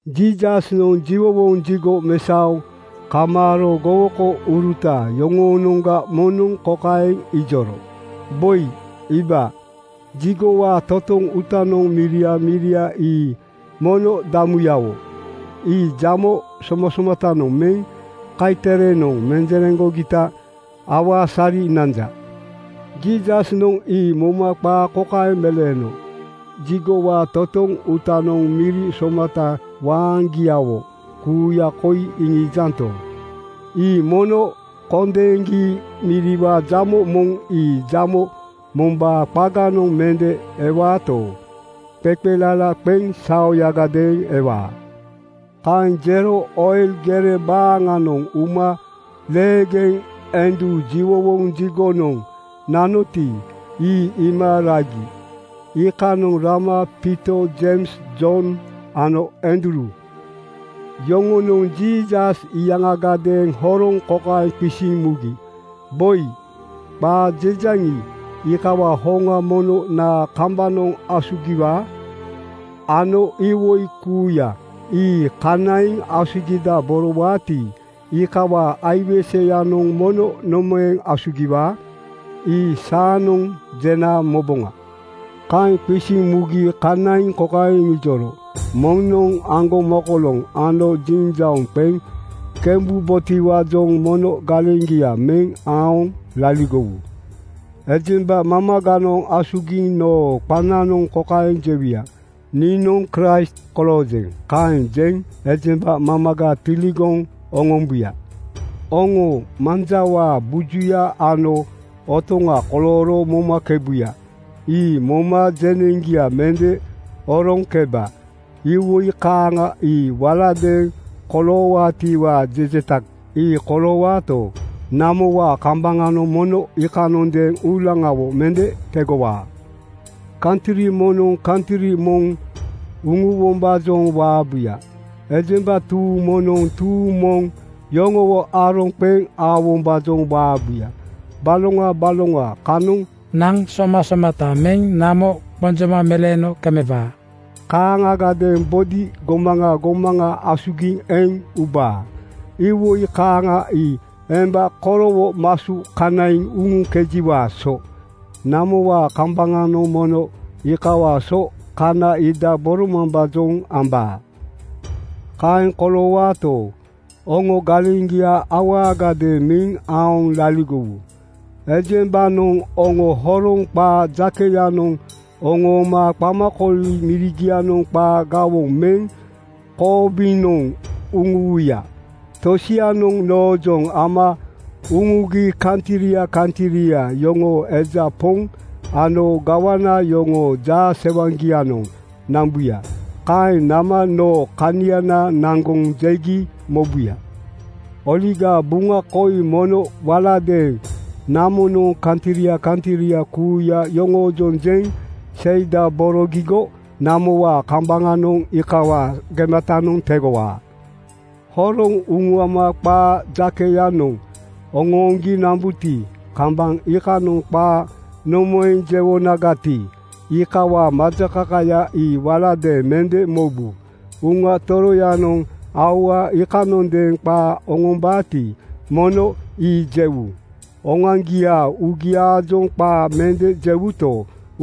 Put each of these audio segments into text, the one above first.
Jiisasnoŋ jiwowoŋ jigo mesaoŋ kamaaro gowokouruta yoŋoonoŋga moŋnoŋ kokaeŋ ijoro, “Boi iiba! Jigowaa totoŋ uutanoŋ miria miria ii mono damuyawo. Ii jamo somasomatanoŋ meŋ kaiterenoŋ menjereŋgogita awaasari nanja.” Jiisasnoŋ ii moma qaa kokaeŋ meleeno, “Jigowaa totoŋ uutanoŋ miri somata waaŋgiawo kuuya koi iŋiijanto, ii mono kondeeŋgi miriwaa jamo moŋ ii jamo mombaa qaganoŋ mende ewaato, qeqelala qeŋ saoyagadeeŋ ewaa.” Kaeŋ jero Oil gere baaŋanoŋ uma leegeŋ endu jiwowoŋ jigonoŋ nanoti, ii iima ragi. Iikanoŋ rama Piito, Jeims, Jon ano Andruu yoŋonoŋ Jiisas iyaŋagadeeŋ horoŋ kokaeŋ qisiŋ mugi, “Boi, qaa jejaŋi, iikawaa hoŋa mono naa kambanoŋ asugiwaa ano iwoi kuuya ii kanaiŋ asugidaborowaati, iikawaa aiweseyanoŋ mono nomaeŋ asugiwaa? Ii saanoŋ jena moboŋa.” Kaeŋ qisiŋ mugi kanaiŋ kokaeŋ iŋijoro, “Moŋnoŋ aŋgomokoloŋ ano jiŋjauŋ qeŋ kembubotiwaajoŋ mono galeŋgia meŋ aoŋ laligowu. “Ejemba mamaganoŋ asugiŋ noo qananoŋ kokaeŋ jewuya, ‘Niinoŋ Kraist koloojeŋ.’ Kaeŋ jeŋ ejemba mamaga tiligoŋ oŋombuya. Oŋo manjawaa bujuya ano otoŋa kolooro momakebuya. Ii moma jeneŋgia mende oroŋkeba. Iwoi kaaŋa ii walagadeeŋ koloowaatiwaa jejeta. Ii koloowaato, namowaa kambaŋanoŋ mono iikanondeeŋ uulaŋawo mende tegowaa. Kantri moŋnoŋ kantri moŋ uŋuwombaajoŋ waabuya. Ejemba tuuŋ moŋnoŋ tuuŋ moŋ yoŋowo aroŋ qeŋ aowombaajoŋ waabuya. Baloŋa baloŋa kanoŋ naŋ somasomata meŋ namo qonjoma meleeno kemeŋkebaa. Kaaŋagadeeŋ bodi gomaŋa gomaŋa asugiŋ eŋ ubaa. Iwoi kaaŋa ii emba korowonoŋ masu kanaiŋ uŋuŋkejiwaa so. Namowaa kambaŋanoŋ mono iikawaa so kanaidaboromambaajoŋ ambaa. “Kaeŋ koloowaato, oŋo galeŋgia awaagadeeŋ meŋ aoŋ laligowu. Ejembanoŋ oŋo horoŋ qaa jakeyanoŋ oŋooma qamakooli mirigianoŋ qaa gawoŋ meŋ koobinoŋ uŋuwuya. Tosianoŋ noojoŋ ama uŋuaŋgi kantria kantria yoŋoo eja poŋ ano gawana yoŋoo jaasewaŋgianoŋ nambuya. Kaeŋ nama noo kaniana naŋgoŋ jegi mobuya. Oligaa Buŋa koi mono waladeeŋ namonoŋ kantria kantria kuuya yoŋoojoŋ jeŋ seidaborogigo namowaa kambaŋanoŋ iikawaa gematanoŋ tegowaa. Horoŋ uŋuama qaa jakeyanoŋ oŋooŋgi nambuti, kambaŋ iikanoŋ qaa nomaeŋ jewonagati, iikawaa majakakaya ii waladeeŋ mende mobu. Uŋa Toroyanoŋ aua iikanondeeŋ qaa oŋombaati, mono ii jewu. Oŋoaŋgiaa uugiaajoŋ qaa mende jewuto,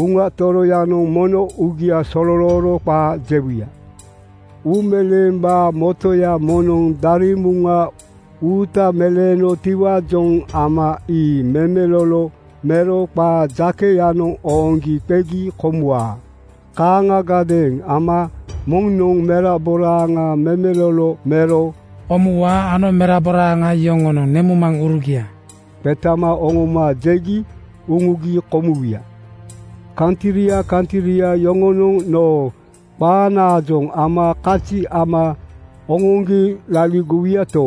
Uŋa Toroyanoŋ mono uugia sololooro qaa jewuya. Uumeleembaa motoya moŋnoŋ daremuŋa uuta meleenotiwaajoŋ ama ii memelolo mero qaa jakeyanoŋ ooŋgi qegi komuwaa. Kaaŋagadeeŋ ama moŋnoŋ meraboraaŋa memelolo mero komuwaa ano meraboraaŋa yoŋonoŋ nemuŋmaŋurugia qetama oŋoma jegi uŋugi komuwuya. Kantria kantria yoŋonoŋ noo qanaajoŋ ama kazi ama oŋoŋgi laligowuyato,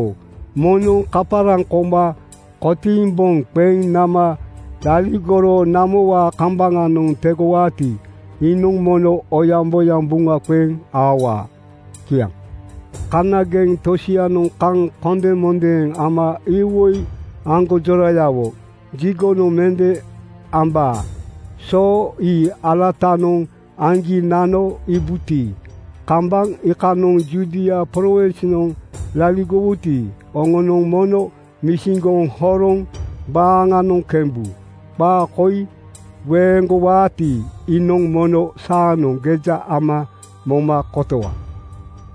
moŋnoŋ kaparaŋ koma kotiiŋ boŋ qeŋ nama laligoro namowaa kambaŋanoŋ tegowaati, iinoŋ mono oyaŋboyaŋ buŋa qeŋ aowaa.” Kiaŋ. “Kanageŋ tosianoŋ kaŋ kondemondeeŋ ama iwoi aŋgonjorayawo jigonoŋ mende aambaa so ii alatanoŋ aŋgi nano iibuti, kambaŋ iikanoŋ Judia prowinsnoŋ laligowuti, oŋonoŋ mono misiŋgoŋ horoŋ baaŋanoŋ kembu. Qaa koi weeŋgowaati, iinoŋ mono saanoŋ geja ama moma kotowa.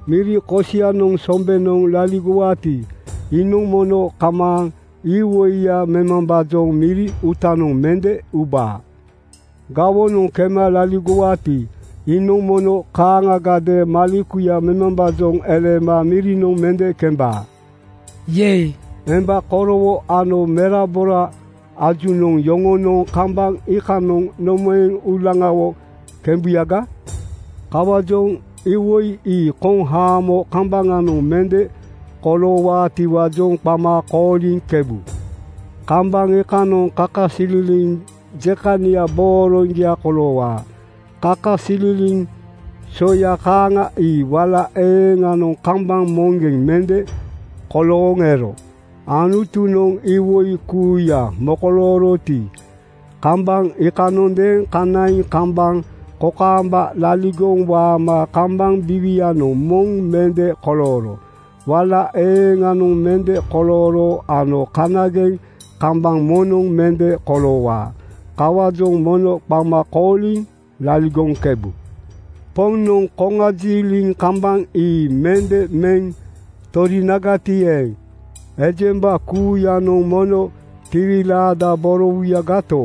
Miri kosianoŋ sombenoŋ laligowaati, iinoŋ mono kamaaŋ iwoiya memambaajoŋ miri uutanoŋ mende uba. Gawonoŋ kema laligowaati, iinoŋ mono kaaŋagadeeŋ malekuya memambaajoŋ eleema mirinoŋ mende kemba. Yei! Emba korowo ano merabora ajunoŋ yoŋonoŋ kambaŋ iikanoŋ nomaeŋ uulaŋawo kembuyaga. Kawaajoŋ iwoi ii koŋ haamo kambaŋanoŋ mende koloowaatiwaajoŋ qama kooliŋkebu. Kambaŋ iikanoŋ kakasililiŋ jekania booroŋgia koloowaa. Kakasililiŋ soya kaaŋa ii wala eeŋanoŋ kambaŋ moŋgeŋ mende kolooŋ ero. Anutunoŋ iwoi kuuya mokolooroti, kambaŋ iikanondeeŋ kanaiŋ kambaŋ kokaamba laligoŋ waama kambaŋ biiwianoŋ moŋ mende kolooro. Wala eeŋanoŋ mende kolooro ano kanageŋ kambaŋ moŋnoŋ mende koloowaa. Kawaajoŋ mono qama kooliŋ laligoŋkebu. Poŋnoŋ koŋajiliŋ kambaŋ ii mende meŋ torinagati eeŋ, ejemba kuuyanoŋ mono tiwilaadaborowuyagato,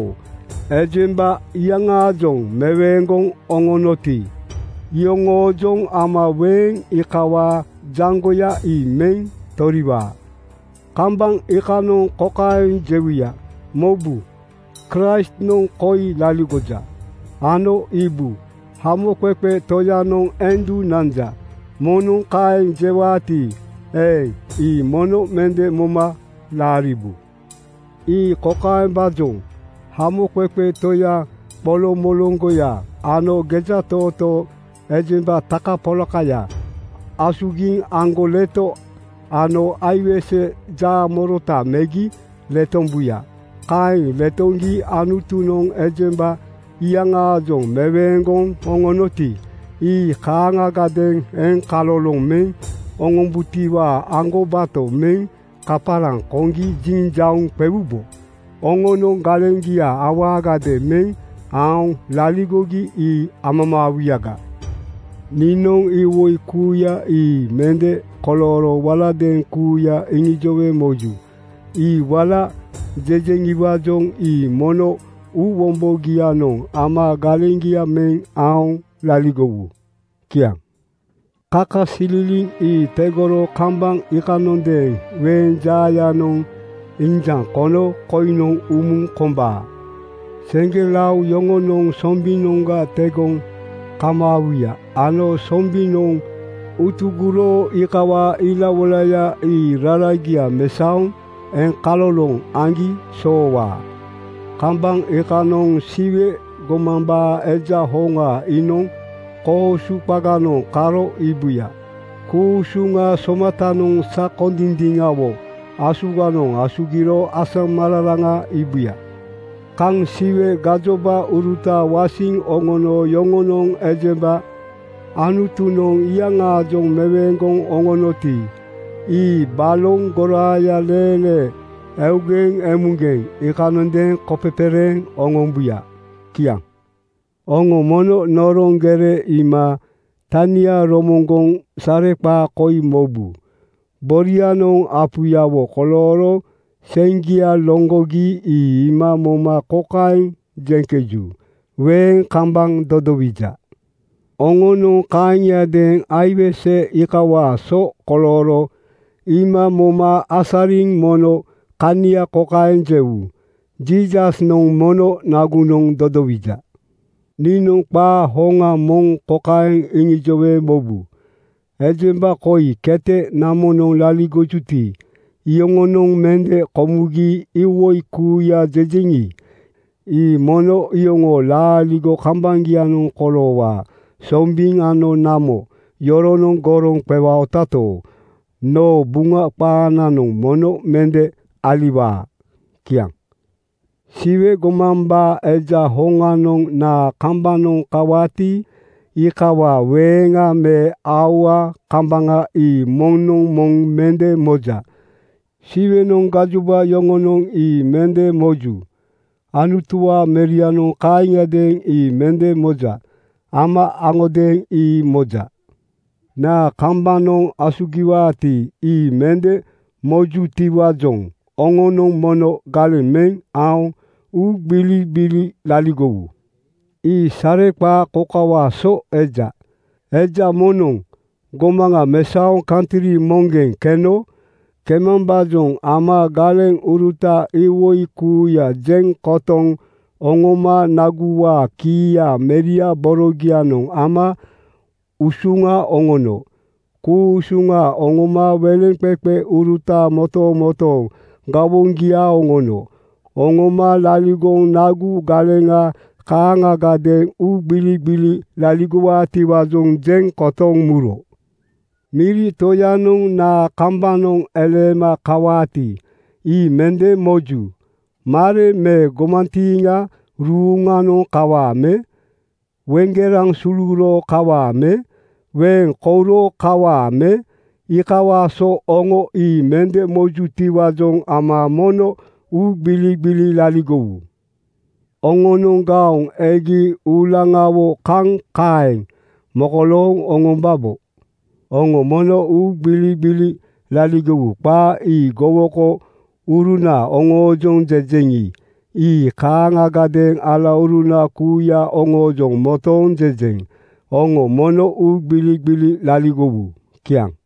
ejemba iyaŋaajoŋ meweeŋgoŋ oŋonoti, iyoŋoojoŋ ama weeŋ iikawaa jaŋgoya ii meŋ toriwaa. “Kambaŋ iikanoŋ kokaeŋ jewuya, ‘Mobu! Kraistnoŋ koi laligoja,’ ano ‘Iibu! Hamoqeqe Toyanoŋ endu nanja.’ Moŋnoŋ kaeŋ jewaati eeŋ, ii mono mende moma laariwu. Ii kokaembaajoŋ: Hamoqeqe toya qoloŋmoloŋgoya ano gejatootoo ejemba takapolakaya asugiŋ aŋgoleto ano aiwese jaamorota megi letombuya. Kaeŋ letoŋgi Anutunoŋ ejemba iyaŋaajoŋ meweeŋgoŋ oŋonoti, ii kaaŋagadeeŋ eŋkaloloŋ meŋ oŋombutiwaa aŋgobato meŋ kaparaŋ koŋgi jiŋjauŋ qewubo. Oŋonoŋ galeŋgia awaagadeeŋ meŋ aoŋ laligogi ii amamaawuyaga. Niinoŋ iwoi kuuya ii mende kolooro waladeeŋ kuuya iŋijowe moju. Ii wala jejeŋiwaajoŋ ii mono uuwombogianoŋ ama galeŋgia meŋ aoŋ laligowu.” Kiaŋ. “Kakasililiŋ ii tegoro kambaŋ iikanondeeŋ weeŋ jaayanoŋ injaŋ kono koiŋnoŋ umuŋ kombaa. Seŋgelao yoŋonoŋ sombinoŋga tegoŋ kamaawuya ano sombinoŋ utugoro iikawaa ilawoilaya ii raragia mesaoŋ eŋkaloloŋ aŋgi soowaa. Kambaŋ iikanoŋ Siwe gomambaa Eja hoŋa iinoŋ koosu qaganoŋ karo iibuya. Ku-usuŋa somatanoŋ sakondindiŋawo asuganoŋ asugiro asamararaŋa iibuya. Kaŋ Siwe gajobauruta wasiŋ oŋono yoŋonoŋ ejemba Anutunoŋ iyaŋaajoŋ meweeŋgoŋ oŋonoti, ii baloŋ goraaya leelee, eugeŋ emugeŋ iikanondeeŋ kopepereeŋ oŋombuya.” Kiaŋ. “Oŋo mono noroŋ gere iima tania romoŋgoŋ sareqaa koi mobu. Borianoŋ apuyawo kolooro seŋgia loŋgogi ii iima moma kokaeŋ jeŋkeju, ‘Weeŋ kambaŋ dodowija.’ Oŋonoŋ kaaŋiadeeŋ aiwese iikawaa so kolooro iima moma asariŋ mono kania kokaeŋ jewu, ‘Jiisasnoŋ mono nagunoŋ dodowija.’ Niinoŋ qaa hoŋa moŋ kokaeŋ iŋijowe mobu: Ejemba koi kete namonoŋ laligojuti, iyoŋonoŋ mende komugi iwoi kuuya jejeŋi, ii mono iyoŋoo laaligo kambaŋgianoŋ koloowaa Sombiŋ ano namo yoronoŋ goroŋ qewaotato, noo Buŋa qaananoŋ mono mende aliwaa.” Kiaŋ. “Siwe gomambaa Eja hoŋanoŋ naa kambanoŋ kawaati, iikawaa weeŋa me aua kambaŋa ii moŋnoŋ moŋ mende moja. Siwenoŋ gajoba yoŋonoŋ ii mende moju. Anutuwaa Merianoŋ kaaŋiadeeŋ ii mende moja. Ama aŋodeeŋ ii moja. Naa kambanoŋ asugiwaati, ii mende mojutiwaajoŋ oŋonoŋ mono galeŋ meŋ aoŋ uugbiligbili laligowu. Ii sareqaa kokawaa so eja: Eja moŋnoŋ gomaŋa mesaoŋ kantri moŋgeŋ keno. Kemambaajoŋ ama galeŋuruta iwoi kuuya jeŋ kotoŋ oŋoma naguwaa kiiya meria borogianoŋ ama usuŋa oŋono. Ku-usuŋa oŋoma weleŋqeqeuruta motomotooŋ gawoŋgia oŋono. Oŋoma laligoŋ nagu galeŋa kaaŋagadeeŋ uugbiligbili laligowaatiwaajoŋ jeŋ kotoŋ muro. Miri toyanoŋ naa kambanoŋ eleema kawaati, ii mende moju. Mare me gomantiiŋa ruuŋanoŋ kawaa me? Weŋgeraŋ suluro kawaa me? Weeŋ kouro kawaa me? Iikawaa so oŋo ii mende mojutiwaajoŋ ama mono uugbiligbili laligowu. Oŋonoŋ gaoŋ egi uulaŋawo kaŋ kaeŋ mokolooŋ oŋombabo. Oŋo mono uugbiligbili laligowu. Qaa ii gowokouruna oŋoojoŋ jejeŋi, ii kaaŋagadeeŋ alauruna kuuya oŋoojoŋ motooŋ jejeŋ: Oŋo mono uugbiligbili laligowu.” Kiaŋ.